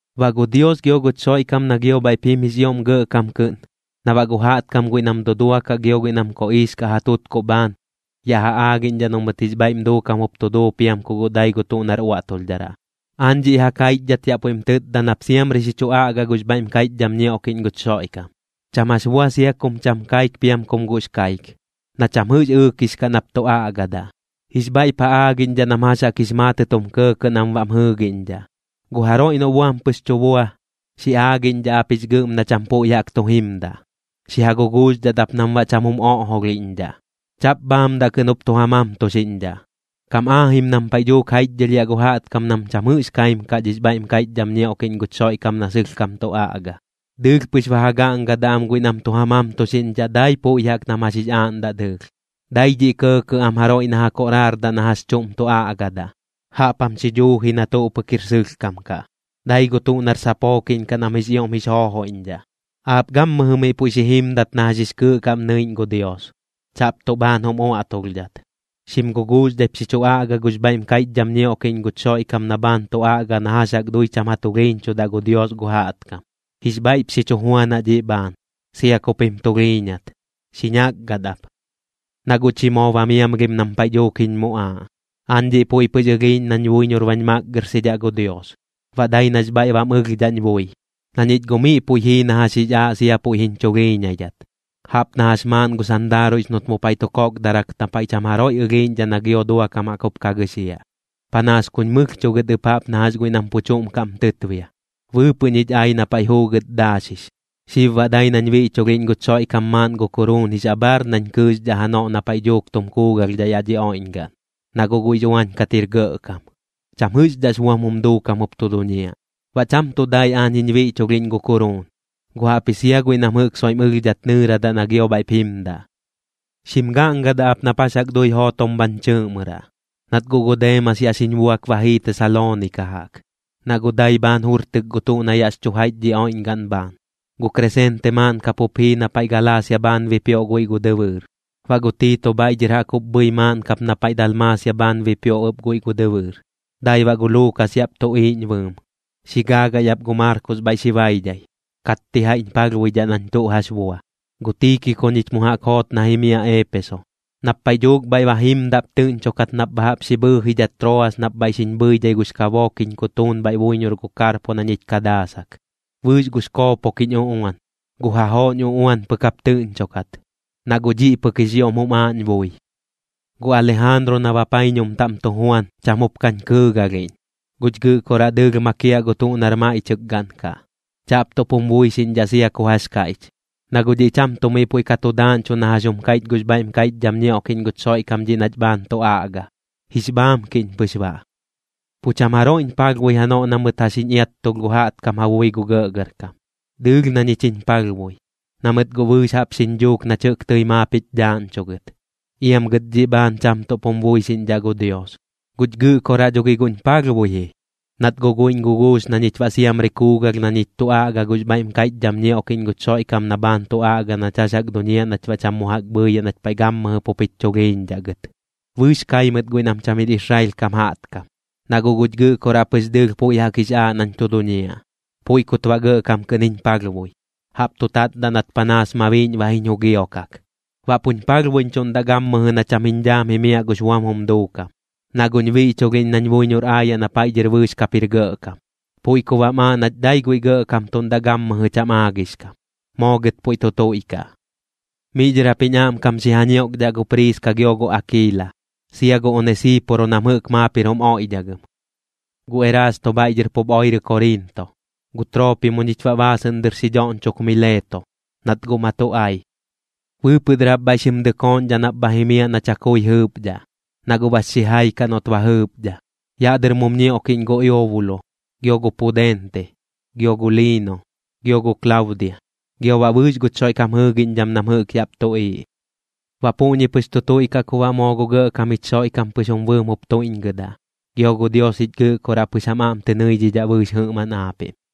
Baꞌ gu Dios gio guch Xoiꞌkam na gio bhaiꞌp jim jix ioꞌm gɇꞌkam kɨꞌn, na baꞌ gu jaꞌtkam guiꞌ nam duduakaꞌ gio guiꞌ nam koꞌiix kaꞌ ja tutkuꞌ bhaan, yaꞌ ja aagiꞌñdhaꞌ noꞌ mɨt jix bhaiꞌm duukam jup tu duu piam ku guꞌ dai gu tuꞌ nar uaꞌtulhdharaꞌ, aañ dhiꞌ ja kaiꞌchdhat yaꞌ puiꞌm tɨɨdaꞌ nap siamri xi chu aꞌgaꞌ gux bhaiꞌm kaiꞌchdham ñioꞌkiꞌñ guch Xoiꞌkam. Cham jax bua sia kum cham kaik piam kum guꞌx kaik, na cham jɨꞌx ɨɨkix kaꞌ nap tu aꞌgadaꞌ. Jix bhaiꞌp ja aagiꞌñdhaꞌ nam jax jaꞌk jix maatɨt jum kɇɇkɇꞌ nam baꞌm jɨɨgiꞌñdhaꞌ. Gu jaroiꞌ noꞌ buam pɨx tu bua, xi aagiꞌñdhaꞌ ap jix gɨꞌm na cham puiꞌ jaꞌk tu jimdaꞌ. Xi ja guguuxdhat ap nam baꞌ cham jum oꞌjolhiꞌñdhaꞌ. Chaꞌp bhaamdaꞌ kɨꞌn jup tu ja mamtuxiꞌñdhaꞌ. Kam aajim nam paiꞌ dhuuk jaiꞌchdhɨlhiaꞌ gu jaꞌtkam nam cham jɨꞌx ka kaim kaꞌ dhix bhaiꞌm kaiꞌchdham ñioꞌkiꞌñ guch Xoiꞌkam na sɨlhkam tu aꞌga. Dɨɨlh pɨx ba ja gaꞌngadaꞌ am guiꞌ nam tu ja mamtuxiꞌñdhaꞌ dai puiꞌ jaꞌk nam jax jix aaꞌndaꞌ dɨɨlh. Dai dhiꞌ kɇɇkɇꞌ am jaroiꞌ na ja koꞌraardaꞌ na jax chuꞌm tu aꞌgadaꞌ. Jaꞌp jam xi dhuuji na tuꞌ pɨk jir sɨlhkam kaꞌ, dai gu tuꞌ nar sapookiꞌñ kaꞌ nam jix ioꞌm jix joojoiꞌñdhaꞌ. Aap gammɨjɨ miꞌ puiꞌ xi jimdat na jax jix kɨɨꞌ kaꞌm nɨiꞌñ gu Dios, chaꞌp tuꞌ bhaan jum uaꞌtulhdhat. Xim guguuxdhaip xi chu aꞌgaꞌ gux bhaiꞌm kaiꞌchdham ñioꞌkiꞌñ guch Xoiꞌkam na bhaan tu aꞌga na jax jaꞌk dui cham ja tulhiiñchudaꞌ gu Dios gu jaꞌtkam. Jix bhaiꞌp xi chu juanaꞌ dhiꞌ bhaan, sia kup jim tulhiiñat, xi ñakgat ap. Na guꞌ chi moo ba miamlhim nam paiꞌ dhuuk jiñ muꞌaaꞌ, aañ dhiꞌ puiꞌ pɨx ɨlhiiꞌñ nañ buiñor bañ makgɨrxidhaꞌ gu Dios, baꞌ dai nax bhaiꞌ bam ɨlhdhaꞌñ bui. Na ñich guꞌ miꞌ puiꞌ jii na jax jix aaꞌ sia puiꞌ jiñ chulhiiñaidhat, jaꞌp na jax maaꞌn gu sandaaruiꞌx noꞌt mu paiꞌ tu kokdarak na paiꞌ cham jaroiꞌ ɨlhiiꞌñdhaꞌ na gio duakam jaꞌk jup ka gɨxiaꞌ. Panaas kuñ mɨlhchuꞌ gɨt ɨp jaꞌp na jax guiꞌ nam pu chuꞌm kaꞌm tɨtbia, bɨɨpɨꞌ ñich ai na paiꞌ juugɨt daaxix. Xib baꞌ dai nañ biꞌchulhiꞌñ guch Xoiꞌkam maaꞌn gu kuruun jix abhaar nañ kɨɨxdhaꞌ janoꞌ na paiꞌ dhuuk tum kuugalhdhaꞌ yaꞌ dhi oiꞌñgaꞌn. Na guꞌ guiꞌx uañ kat jir gɇꞌkam, cham jɨꞌxdhaꞌx buam jum duukam jup tu duñiaꞌ. Baꞌ cham tuꞌ dai aañ jiñ biꞌchulhiꞌñ gu kuruun, guꞌ jaꞌpji sia guiꞌ nam jɨꞌk soiꞌm ɨlhdhat nɨɨradaꞌ na gio bhaiꞌp jimdaꞌ. Xim gaꞌngadaꞌ ap nap jax jaꞌk dui jootom bhañ chɨɨꞌmɨraꞌ. Nat guꞌ gu Deemas yaꞌ xiñ buak ba jii Tesaloonika jaꞌk, na guꞌ dai bhaan jurtɨk gu tuꞌ na yaꞌx chu jaiꞌch dhi oiꞌñgaꞌn bhaan. Gu Kresente maaꞌn kap jup jii na paiꞌ Galaasia bhaan bipioꞌ guiꞌ gu dɨbɨɨr. Baꞌ gu Tiito bhaiꞌ dhɨr jaꞌk jup bhɨi maaꞌn kap na paiꞌ Dalmaasia bhaan bipioꞌ ɨp guiꞌ gu dɨbɨɨr. Dai baꞌ gu Luukas yaꞌp tuꞌiiꞌñ bɨɨm. Xi gaagai ap gu Maarkos bhaiꞌ xi baidhai, katti jaiꞌñ palhbuidhaꞌ nañ tuꞌ jax bua. Gu Tiikiko ñich mu jaꞌk joot na jimiaꞌ Eepeso. Nap paiꞌ dhuuk bhaiꞌ ba jimdaꞌp tɨꞌñchokat nap bha jaꞌp xi bhɨɨjidhat Troas nap bhaiꞌ xiñ bhɨidhai gux kabook jiñ kutuun bhaiꞌ buiñor gu Karpo na ñich ka daasak, bɨɨx gux koopok jiñ uꞌuan. Gu jajooꞌñ uꞌuan pɨk jap tɨꞌñchokat, na guꞌ dhiꞌ pɨk jix ioꞌm jum aaꞌñ bui. Gu Alijaanru na bapaiñum taꞌm tu juan, cham jup kañ kɨɨgalhiꞌñ. Guch Gɨꞌkoraꞌ dɨɨlh makiaꞌ gu tuꞌ nar maiꞌchɨkgaꞌn kaꞌ. Chaꞌp tuꞌp jum buixiꞌñdhaꞌ sia ku jax kaiꞌch, na guꞌ dhiꞌ cham tuꞌ miꞌ puiꞌ ka tu daaꞌñchuꞌ na jax jum kaiꞌch gux bhaiꞌm kaiꞌchdham ñioꞌkiꞌñ guch Xoiꞌkam dhiꞌ nach bhaan tu aꞌga, jix bhaamkiꞌñ pɨx baꞌ. Pu cham jaroiꞌñ palhbui janoꞌ na mɨt jax jiñ iattulh gu jaꞌtkam ja bui gu gɇꞌgɇrkam. Dɨɨlh na ñich jiñ palhbui, na mɨt guꞌ bɨɨx jaꞌp xiñ dhuuk nach jɨꞌk tɨi maap jich dhaaꞌñchugɨt. Iam gɨt dhiꞌ bhaan cham tuꞌp jum buixiꞌñdhaꞌ gu Dios. Guch Gɨꞌkoraꞌ dho gi guꞌñ palhbui ji, nat guꞌ guiꞌñ guguux na ñich baꞌ siamri kuugalh na ñich tu aꞌga gux bhaiꞌm kaiꞌchdham ñioꞌkiꞌñ guch Xoiꞌkam na bhaan tu aꞌga nach jax jaꞌk duñiaꞌ nach baꞌ cham mu jaꞌk bhɨɨyaꞌ nach paiꞌ gammɨjɨ pup jich chulhiiñdhaꞌ gɨt. Bɨɨx kai mɨt guiꞌ nam cham jir Israel kam jaꞌtkam, na guꞌ guch Gɨꞌkoraꞌ pɨx dɨɨlh puiꞌ jaꞌk jix aaꞌ nañ tu duñiaꞌ, puiꞌ kut baꞌ gɇꞌkam kɨꞌn jiñ palhbui, jaꞌp tu tatdaꞌ nat panaas mabiiꞌñ ba jiñ jugiokak. Baꞌ puñ palhbuiꞌñchuꞌndaꞌ gammɨjɨ na cham jiñ dhaam jimiaꞌ gux buam jum duukam, na guꞌñ biꞌchulhiꞌñ nañ buiñor aayaꞌ na paiꞌ dhɨr bɨɨx kap jir gɇꞌkam. Puiꞌ ku baꞌm aaꞌ nach dai guiꞌ gɇꞌkamtuꞌndaꞌ gammɨjɨ cham aagix kam. Moo gɨt puiꞌ tu tuiꞌkaꞌ. Miꞌ dhɨr jap jiñ aꞌmkam xi ja ñioꞌkdhaꞌ gu Priiska gio gu Akiila, sia gu Onesiiporo nam jɨꞌk maap jir jum oiꞌdhagɨm. Gu Erasto bhaiꞌ dhɨr pup oirɨ Koriinto. Gu Troopimo ñich baꞌ baasɨꞌn dɨr xi dhoꞌñchok Mileeto, nat guꞌ ma tu ai. Bɨɨpɨꞌ dɨr jap bhaiꞌ xim dɨkooꞌñdhaꞌ nap bha jimiaꞌ na chakui jɨɨpdhaꞌ, na guꞌ bax xijai kaꞌ noꞌt ba jɨɨpdha. Yaꞌ dɨr mum ñioꞌkiꞌñ gu Eubulo, gio gu Pudente, gio gu Liino, gio gu Klaudia, gio baꞌ bɨɨx guch Xoiꞌkam jɨɨgiꞌñdham nam jɨꞌk yaꞌp tuꞌiiꞌ. Baꞌ puꞌñi pɨx tu tuiꞌkaꞌ ku baꞌ moo gu Gɇꞌkam jich Xoiꞌkam pɨx jum bɨɨm jup tuiꞌñgɨdaꞌ, gio gu Dios jich Gɨꞌkoraꞌ pɨx jam aꞌm tɨ nɨidhidhaꞌ bɨɨx jɨꞌmaꞌn aapiꞌm.